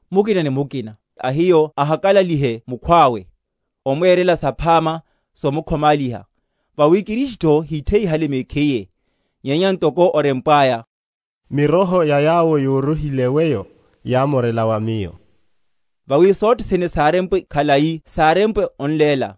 Mukina ni mukina a hiyo ahakalalihe mukhwawe, omwerela saphama, somkhomáliha. Vawi Kristutho hítheyihale mekhiye; nyenya ntoko orempwaya, Miroho ya yawo yórohile weyo yámorela va Miyo. Vawi sothene sárempwe khalai sárepwenle onléla,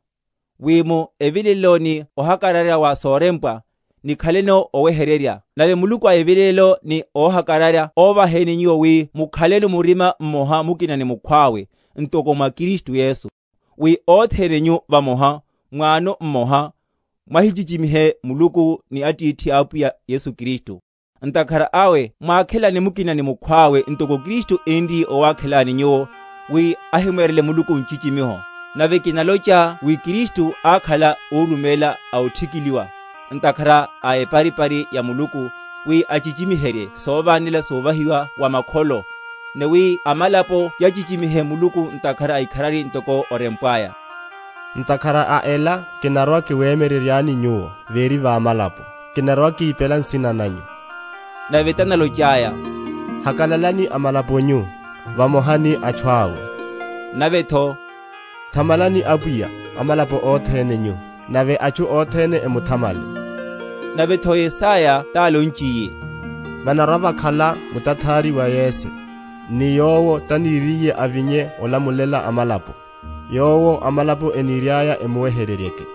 wi mu evilelelo ni ohakararya wa sorempwa, nikhaleno oweheryerya. Nave Muluku a evilelelo ni óhakararya óvaheni nyuwo wi mukhaleno murima mmoha mukina ni mukhwawe, ntoko mwa Kristu Yesu; wi othene nyu vamoha, m’wano mmoha, mwahimuchichimihe Muluku ni Atithi a Apwiyahu Yesu Kristu. Ntakhara awe mwákhelane mukina ni mukhwawe, ntokotho Kristu énriye owakhelani nyuwo, wi ahimwerele Muluku nchichimiho. Nave kinalocha wi Kristu ákhala órumela a othikiliwa, ntakhara a eparipari ya Muluku, wi achichimiherye sovanela sovahiwa wa makholo, ni wi amalapo yahimuchichimihe Muluku, ntakhara a ikharari; ntoko orempwaya, Ntakhara a ela kinarwa‐kiwemyeryeryani Nyuwo, véri va amalapo, Kinarwa‐kipela nsina nanyu. Navetho tanalochaya, Hakalalani amalapo nyu, vamoha ni atchu awe. Navetho, Thamalani Apwiya, amalapo othene nyu; Nave atchu othene emthamale. Navetho, Yesaya tanalochiye, Vanarwa‐vakhala mutathari wa Yese, Ni Yowo taniriye avinye olamulela amalapo; Yowo amalapo eniriaya emuweheryeryeke.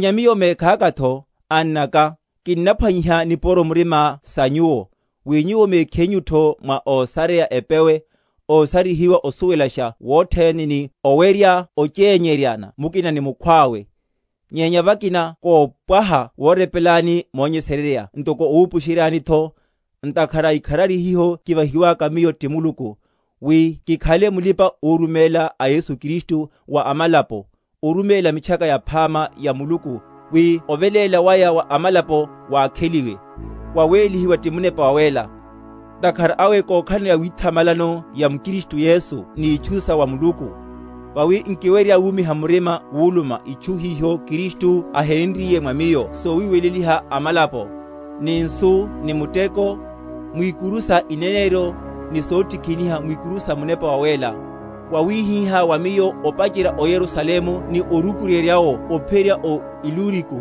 Nyenya miyo mekhakatho, annaka, kinnaphwanyiha nipuro murima sa nyuwo, wi nyuwo mekhinyutho mwa ósareya epewe, ósarihiwa osuwelasha wothene, ni owerya ochényeryana mukina ni mukhwawe. Nyenya vakina kopwaha worepelani monyesererya ntoko owupusheryanitho, ntakhara a ikharari hiho kivahi?-?waka miyo ti Muluku, wi kikhale mulipa‐oruméla a Yesu Kristu, wa amalapo, oruméla Mitchaka Yaphama ya Muluku, wi oveléla waya wa amalapo wakheliwe, wawélihiwe ti Munepa Wawéla. Ntakhara awe kokhalano yawithamalano ya m’Kristu Yesu ni itchu sa wa Muluku. Vawi nkiwerya wumiha murima wuluma itchu hiho Kristu ahénriye mwa miyo sowiweleliha amalapo, ni nsu ni muteko, mwikuru sa ineneryo ni sotikiniha, mwikuru sa Munepa Wawéla; wawihihá wa miyo opacherya o Yerusalemu ni orukuryerya’wo ophiyerya o Iluriko,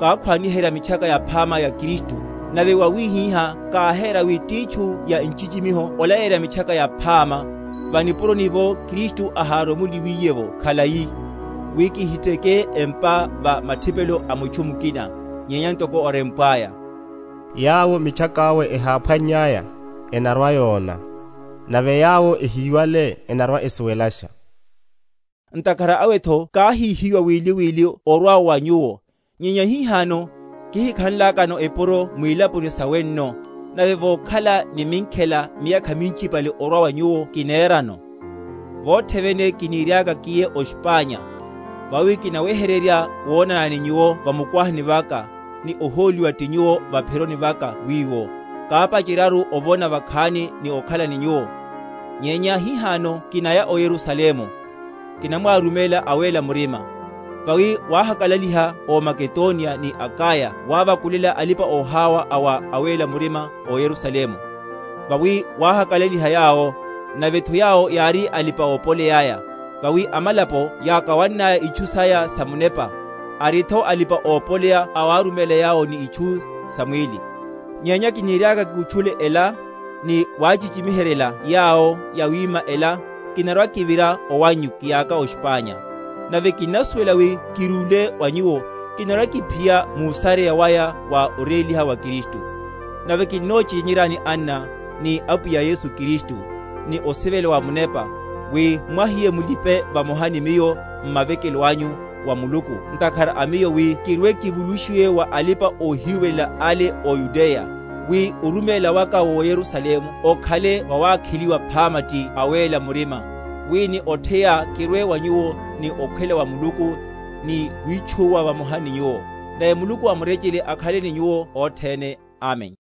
kákhwaniherya Mitchaka Yaphama ya Kristu; nave yawihihá káhéra wi titchu ya nchichimiho olaleyerya Mitchaka Yaphama, va’puroni’vo Kristu aháromoliwiye’vo khalai, wi kihiteke empa va mathipelo a mutchu mukina. Nyenya ntoko orempwaya, Yawo mitchaka awe eháphwannyaya, enarwa‐yona, Nave yawo ehiwale, enarwa‐esuwelasha. Ntakhara awetho káhíhiwa wili wili orwa wa nyuwo; nyenya hihano, kihikhanlakano epuro mwilaponi sa wenno, nave vokhala ni minkhela miyakha minchipale orwa wa nyuwo kinerano, vothe vene kiniriaka kiye o Spanya. Vawi kinaweheryerya wonana ni nyuwo va mukwahani vaka, ni ohóliwa ti nyuwo va’phironi vaka wiwo, kapacheryaru ovona vakhani ni okhala ni nyuwo. Nyenya hihano kinaya o Yerusalemu, kinamwáruméla awéla murima. Vawi wáhahakalaliha ó Makedoniya ni Akaya wavakulela alipa‐oháwa a wa awéla murima ó Yerusalemu. Vawi wáháhakalaliha yawo; navetho yawo yári alipa‐opoleya’ya. Vawi amalapo yákawannaya itchu saya samunepa, aritho alipa‐opoleya awáruméla yawo ni itchu samwíli. Nyenya kiniriaka kikutchule ela, ni wachichimiheryela yawo yawima ela, kinarwa‐kivira owannyu kiyaka o Spanya. Nave kinnasuwela wi kirúle wa nyuwo, kinarwa‐kiphiya músareya waya wa oréliha wa Kristu. Nave kinnochényeryani, anna, ni Apwiyahu Yesu Kristu, ni osivela wa Munepa, wi mwahiye mulipe vamoha ni miyo m’mavekelo anyu wa Muluku ntakhara a miyo; wi kirwe‐kivulushiwe wa alipa‐ohiwelela ale ó Yudeya; wi oruméla waka wó Yerusalemu okhale wawakheliwa phama ti awéla murima; wi ni otheya kirwe wa nyuwo ni okhwela wa Muluku, ni witchúwa vamoha ni nyuwo. Nave Muluku a murechele akhale ni nyuwo othene. Amen.